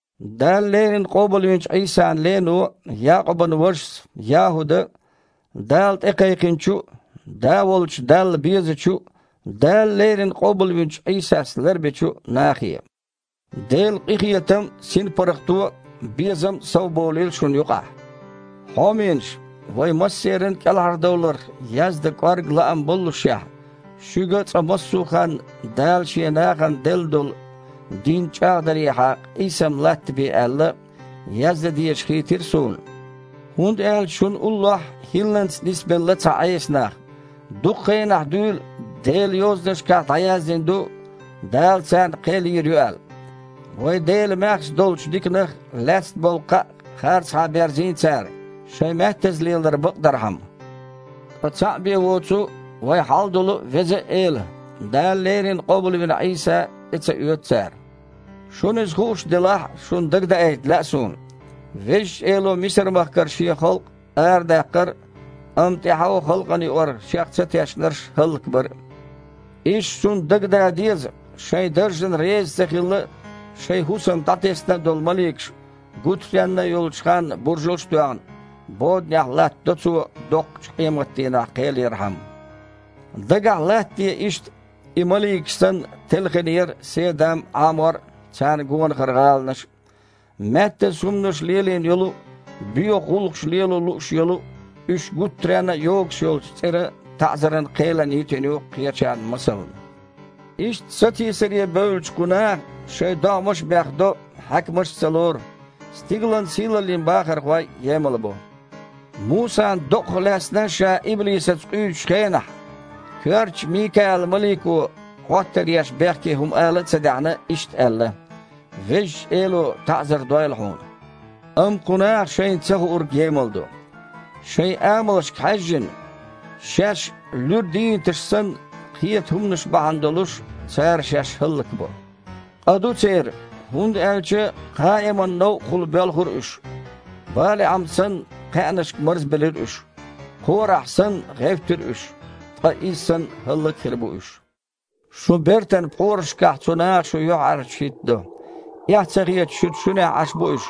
Дала леррина къобалвинчу Іийсан лено, Якъубан вашас, ЯхІуда Дала тІекхайкхинчу а, Да волчу Далла безачу а, Дала леррина къобалвинчу Іийсас ларбечу а нахе: Делан къинхетам а, синпаргІато а, безам а совболийла шуна юкъахь. Хьоменаш! Вайн массеран а кІелхьардовларх яздан кІорга лаам боллушехь, шуьга, цкъа массо а ханна Дала Шен нахана делла долу дин чІагІдарехьа къийсам латтабе аьлла, яздан дезаш хийтира суна, хІунда аьлча шуна уллохь хІилланца нисбелла цхьа Іеса нах. Дукха хенахь дуьйна Делан Йозанашкахь дІаяздина ду, Дала царна кхел йийр ю аьлла. Вайн Делан маьхза долчу диканах лаьцна болу кхаъ харцахьа берзийна цара, шайн маьттаза лелар бакъдархьама. Ткъа цхьаъ бен воцу вайн Хьалдолу а, Веза а Эла, Дала леррина къобалвина Іийса, тІе ца оьцу цара. Шуна иза хууш делахь а, шуна дагадаийта лаьа суна, Везачу Эло Мисар-махкара Шен халкъ арадаккхар а, амма тІаьхьо халкъана юкъара Шех цатешнарш хІаллакбар а. Иштта шуна дагадан деза, шайн даржана реза ца хилла а, шайн хІусам дІатесна а долу маликаш, гуттаренна а йолчу ханна буржалш а тоьхна, боданехь латтадо Цо доккхачу къематдийнахь кхел ярхьама. Дагахь латтаде иштта, и маликаш санна, телхина яра Седам а, Іамор а, царна гонахара гІаланаш а. Маьттаза хІуманаш лелийна йолу а, боьха гІуллакхаш лело лууш йолу а уьш гуттаренна а йогуш йолчу цІеран таІзаран кхелана йитина ю кхечарна масална. Иштта сатийсаре бевллачу кху наха шайн догІмаш а бехдо, хьаькамаш а ца лору, стигалан сийлаллин бахархой а емалбо. Мусан докъах лаьцна ша иблисаца къуьйсучу хенахь коьртачу Микаал-малико, Іоттар еш бехке хІума ала а ца даьхьна, иштта аьлла: «Везачу Эло таІзар дойла хьуна». Амма кху наха шайна цахуург емалдо. Шайн амалшка хьаьжжина, шаьш, луьра дийнаташ санна, кхета хІуманаш бахьана долуш цара шаьш хІаллакбо. Къа ду церан, хІунда аьлча Кхаиман новкъахула боьлхура уьш, БалиІам санна, кхаьънашка марзбелира уьш, Кхорахь санна, гІевттира уьш, ткъа иза санна, хІаллак а хир бу уьш. Шун бертан пхьорашкахь цу наха шу юьхьІаьржачу хІиттадо. Эхь ца хеташ, шуьца шуьнехь Іаш бу уьш,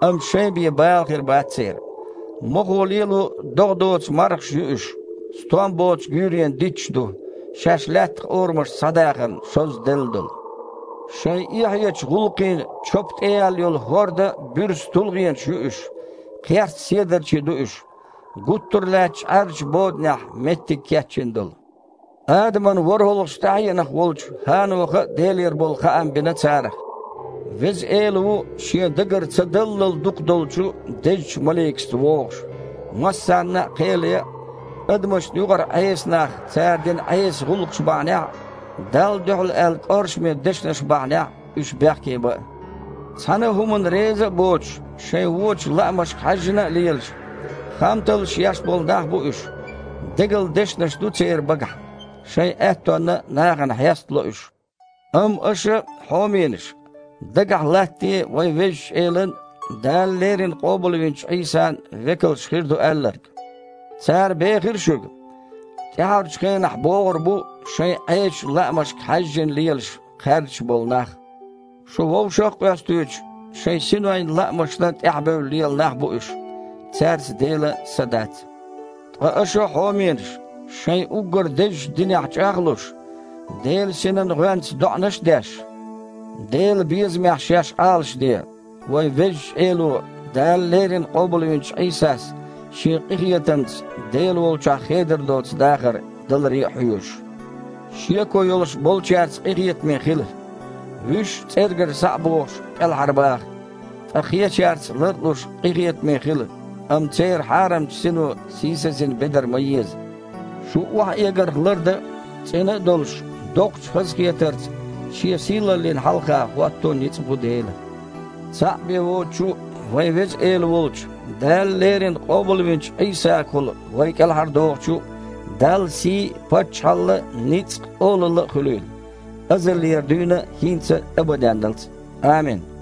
амма шайн бен бала хир бац церан. Мохо лело, догІа доцу мархаш ю уьш, стом боцу гуьйренан дитташ ду, шаьш лаьттах орамашца схьадахарна шозза делла долу. Шайн эхьечу гІуллакхийн чопа тІеяьлла йолу хІордан буьрса тулгІенаш ю уьш, кхерста седарчий ду уьш, гуттар а лаьттачу Іаьржачу боданехь меттиг кечйина долу. Адаман ворхІалгІачу тІаьхьенах волчу ХІаноха а Делера болу хаам бина царах: «Веза Эла ву Шен дагар ца даллал дукха долчу дезачу маликашца вогІуш массарна а кхел ян а, адамашна юкъара Іеса нах цара дина Іеса гІуллакхаш бахьанехь а, Далла дуьхьал аьлла кІоршаме дешнаш бахьанехь а уьш бехке бан а». Цхьана а хІуманна реза а боцуш, шайн вочу лаамашка хьаьжжина а лелаш, хамталлаш еш болу нах бу уьш. Дегала дешнаш ду церан багахь. Шайн аьттонна нахана хьестало уьш. Амма аша, хьоменаш, дагахь латтаде вайн Везачу Элан, Дала леррина къобалвинчу Іийсан векалша хир ду аьлларг. Цара бехира шуьга, тІаьхьарчу хенахь богІур бу шайн Іесачу лаамашка хьаьжжина лелаш, кхаьрдаш болу нах. Шу вовшах а къоьстуьйтуш, шайн синойн лаамашна тІаьхьабевлла лела нах бу уьш. Цаьрца Делан Са дац. Ткъа аша, хьоменаш, шайн уггар дезачу динехь чІагІ а луш, Делан Синан гІоьнца доІанаш а деш, Делан безамехь шаьш Іалашде, вайн Везачу Эло, Дала леррина къобалвинчу Іийсас, Шен къинхетамца Дела волчохь хедар доцу дахар даларе а хьоьжуш. Шеко йолуш болчаьрца къинхетаме хила, вуьш, цІергара схьа а бохуш, кІелхьарбаха, ткъа кхечаьрца, лар а луш, къинхетаме хила, амма церан хьарамчу сино сийсазйина бедар ма еза. Шу охьаэгарх лардан а, цІена а долуш, доккхачу хазахетарца Шен сийлаллина хьалха хІотто а ницкъ бу Делан. Цхьаъ бен воцучу а, вайн Веза Эла волчу, Дала леррина къобалвинчу Іийсагахула вай кІелхьардохучу а Далла сий а, паччахьалла а, ницкъ а, олалла а хуьлийла, азалера дуьйна а, хІинца а, абаденналц а. Амин.